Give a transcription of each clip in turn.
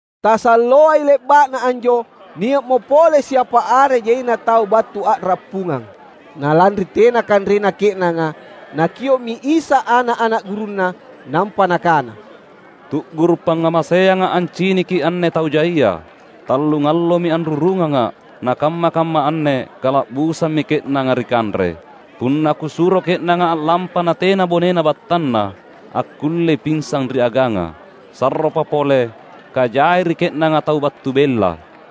Tasalloai le’ba’na anjo, nia’mo pole siapa are jaina tau battu a’rappungang. Na lanri tena kanrena ke’nanga Nakio’mi Isa ana’-ana’ gurunNa nampa Nakana, "Tu’guru’ pangngamaseangA’ anciniki anne tau jaia. Tallungallomi anrurungangA’, nakamma-kamma anne kala’busammi ke’nanga ri kanre. Punna Kusuro ke’nanga a’lampa natena bonena battanna, akkullei pinsang ri aganga. Sarropa pole kajai ri ke’nanga tau battu bella."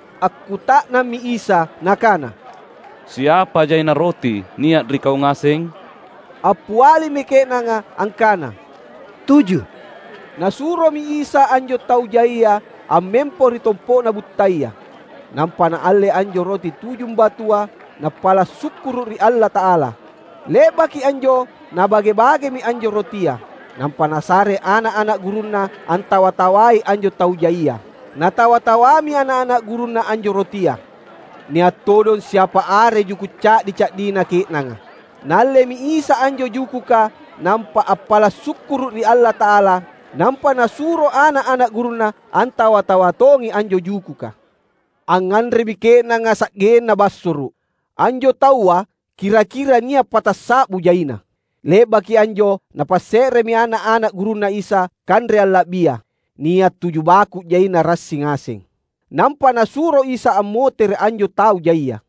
Akkuta’nammi Isa Nakana, "Siapa jaina roti nia’ ri kau ngaseng?" Appialimi ke’nanga angkana, "Tuju." Nasuromi Isa anjo tau jaia ammempo ri tompo’na buttaya. Nampa Naalle anjo roti tujumbatua Nappala’ sukkuru’ ri Allata’ala. Le’baki anjo Nabage-bagemi anjo rotia. Nampa Nasare ana’-ana’ gurunNa antawa-tawai anjo tau jaia. Natawa-tawami ana’-ana’ gurunNa anjo rotia. Nia’ todong siapa are juku’ ca’di-ca’dina ke’nanga. Naallemi Isa anjo jukuka nampa appala’ sukkuru’ ri Allata’ala. Nampa Nasuro ana’-ana’ gurunNa antawa-tawa tongi anjo jukuka. Angnganremi ke’nanga sa’genna bassoro’. Anjo taua kira-kira nia’ patassa’bu jaina. Le’baki anjo napasse’remi ana’-ana’ gurunNa Isa kanre alla’bia. Nia’ tuju baku’ jaina rassi ngaseng. Nampa Nasuro Isa ammotere’ anjo tau jaia.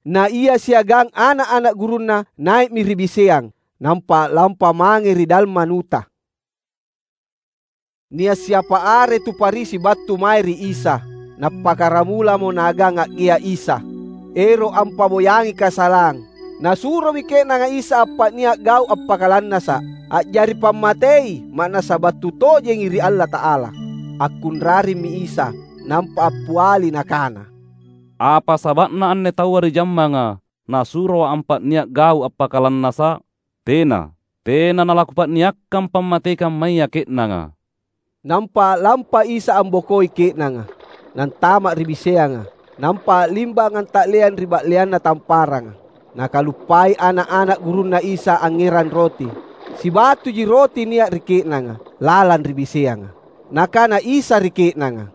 Na Ia siagang ana’-ana’ gurunNa, nai’mi ri biseang nampa a’lampa mange ri Dalmanuta. Nia’ siapa are tu Farisi battu mae ri Isa, nappakkaramulamo naagang a’gea’ Isa, ero’ ampa’boyangi kasalang. Nasuromi ke’nanga Isa appa’nia’ gau’ appakalannasa’, a’jari pammatei ma’nassa battu tojengi ri Allata’ala. Akkunraremmi Isa nampa appiali Nakana, "Apa saba’na anne taua ri jammanga nasuroA’ appa’nia’ gau’ appakalannasa’? Tena! Tena nalaKupa’niakkang pammatei kammaya ke’nanga!" Nampa a’lampa Isa ambokoi ke’nanga, Nantama’ ri biseanga; nampa a’limbang anta’leang ri ba’leanna tamparanga. Nakaluppai ana’-ana’ gurunNa Isa angngerang roti. Sibatuji roti nia’ ri ke’nanga lalang ri biseanga. Nakana Isa ri ke’nanga,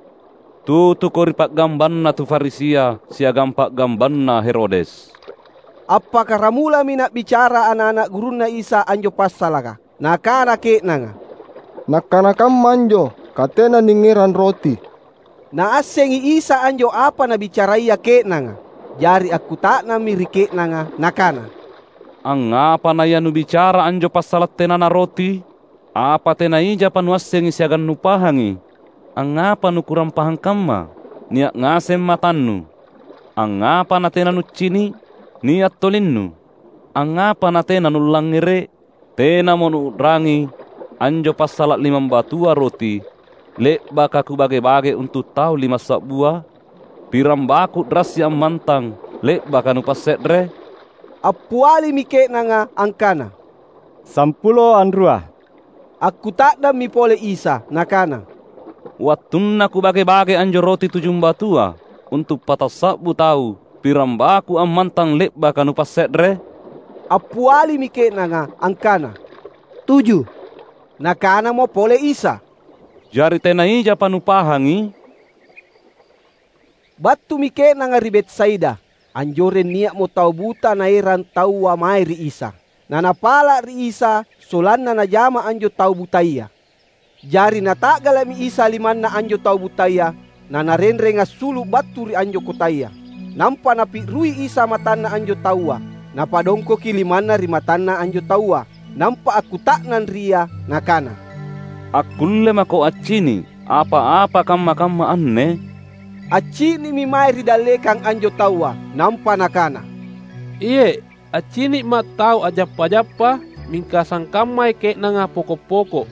"Tutuko ri pa’gambanna tu Farisia siagang pa’gambanna Herodes." Appakkaramulami nabicara ana’-ana’ gurunNa Isa anjo passalaka. Nakana ke’nanga, "Nakkana kamma anjo katena ningngerang roti." Naassengi Isa anjo apa nabicaraya ke’nanga. Jari akkuta’nammi ri ke’nanga Nakana, "Angngapa naia nubicara anjo passala’ tenana roti? Apa tena ijapa nuassengi siagang nupahangi? Angngapa nukurang pahang kamma? Nia’ ngaseng matannu, angngapa natena nuccini’? Nia’ tolinnu, angngapa natena nullangngere’? Tenamo nuu’rangi anjo passala’ limambatua roti, le’baka Kubage-bage untu’ tau limassa’bua? Pirangbaku’ rassi ammantang le’baka nupasse’re?" Appialimi ke’nanga angkana, "Sampulo anrua." Akkuta’nammi pole Isa Nakana, "Wattunna Kubage-bage anjo roti tujumbatua untu’ patassa’bu tau, pirambaku’ ammantang le’baka nupasse’re?" Appialimi ke’nanga angkana, "Tuju." Nakanamo pole Isa, "Jari tena ijapa nupahangi?" Battumi ke’nanga ri Betsaida. Anjoreng nia’mo tau buta naerang taua mae ri Isa, na napala’ ri Isa sollanna Najama anjo tau butaya. Jari Nata’gala’mi Isa limanna anjo tau butaya naNarenreng assulu’ battu ri anjo kotaya. Nampa Napi’rui Isa matanna anjo taua. Napadongkoki limanNa ri matanna anjo taua, nampa akkuta’nang ri ia Nakana, "Akkulle mako accini’ apa-apa kamma-kamma anne?" Accini’mi mae ri dallekang anjo taua, nampa nakana, "Iye’. Accini’ma’ tau a’jappa-jappa mingka sangkammai ke’nanga poko’-poko’."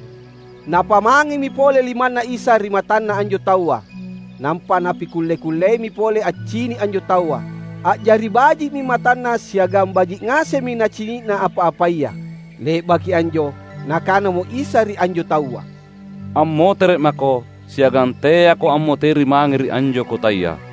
Napamangemi pole limanNa Isa ri matanna anjo taua. Nampa napikulle-kulleimi pole accini’ anjo taua. A’jari baji’mi matanna siagang baji’ ngasemmi nacini’na apa-apaya. Le’baki anjo Nakanamo Isa ri anjo taua, "Ammotere’ mako, siagang teako ammoteri mange ri anjo kotaya."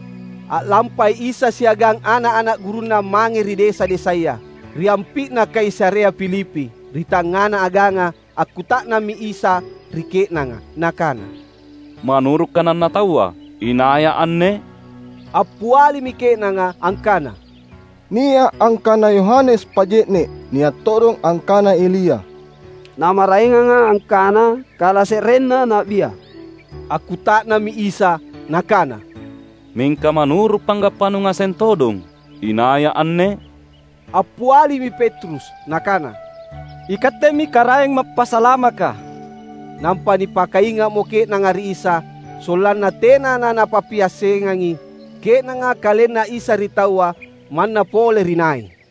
A’lampai Isa siagang ana’-ana’ gurunNa mange ri desa-desaya, ri ampi’na Kaisarea Filipi. Ri tangngana aganga akkuta’nammi Isa ri ke’nanga Nakana, "Manuru’ kananna taua, inaiA’ anne?" Appialimi ke’nanga angkana, "Nia’ angkana Yohanes Paje’ne’; nia’ todong angkana Elia; na maraenganga angkana: kalase’renna na’bia." Akkuta’nammi Isa Nakana, "Mingka manuru’ panggappanu ngaseng todong, inaiA’ anne?" Appialimi Petrus nakana, "IKattemi Karaeng Mappasalamaka!" Nampa nipakainga’mo ke’nanga ri Isa, sollanna tena nanapappiassengangi ke’nanga KalenNa Isa ri taua, manna pole ri nai.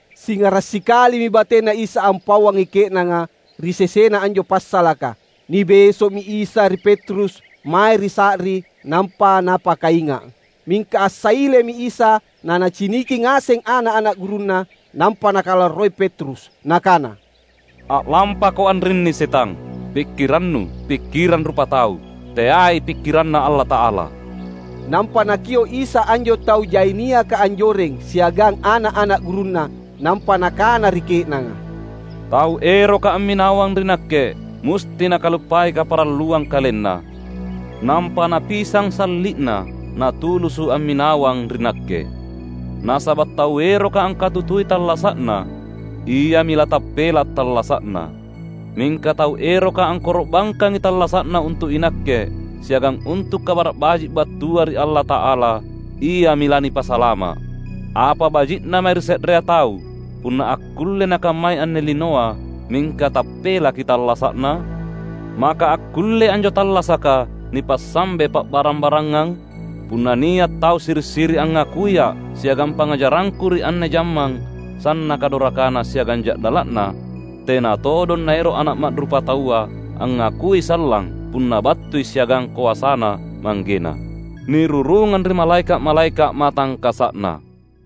Singara’ sikalimi bateNa Isa ampauangi ke’nanga, ri sesena anjo passalaka. Nibeso’mi Isa ri Petrus mae ri sa’ri, nampa napakainga’. Mingka assailemi Isa naNaciniki ngaseng ana’-ana’ gurunNa. Nampa Nakalarroi Petrus Nakana, "A’lampako anrinni setang! Pikkirannu, pikkirang rupatau; teai pikkiranNa Allata’ala!" Nampa Nakio’ Isa anjo tau jai niaka anjoreng, siagang ana’-ana’ gurunNa. Nampa Nakana ri ke’nanga, "Tau eroka amminawang ri Nakke, musti nakaluppai kaparalluang kalenna, nampa napisang salli’na, natulusu’ amminawang ri Nakke. Nasaba’ tau eroka angkatutui tallasa’na, iami latappela’ tallasa’na. Mingka tau eroka angkoro’bangkangi tallasa’na untu’ iNakke, siagang untu’ Kabara’ Baji’ battua ri Allata’ala, iami lanipasalama’. Apa baji’na mae ri se’rea tau, punna akkulle nakammai anne linoa, mingka tappelaki tallasa’na? Maka akkullei anjo tallasaka nipassambe pa’barang-barangang? Punna nia’ tau siri’-siri’ angngakuiA’ siagang pangngajarangKu ri anne jammang sannaka dorakana siagang ja’dala’na, tena todong Naero’ Ana’ Ma’rupataua angngakui sallang punna battui siagang koasaNa ManggeNa, nirurungang ri malaeka’-malaeka’ matangkasa’Na."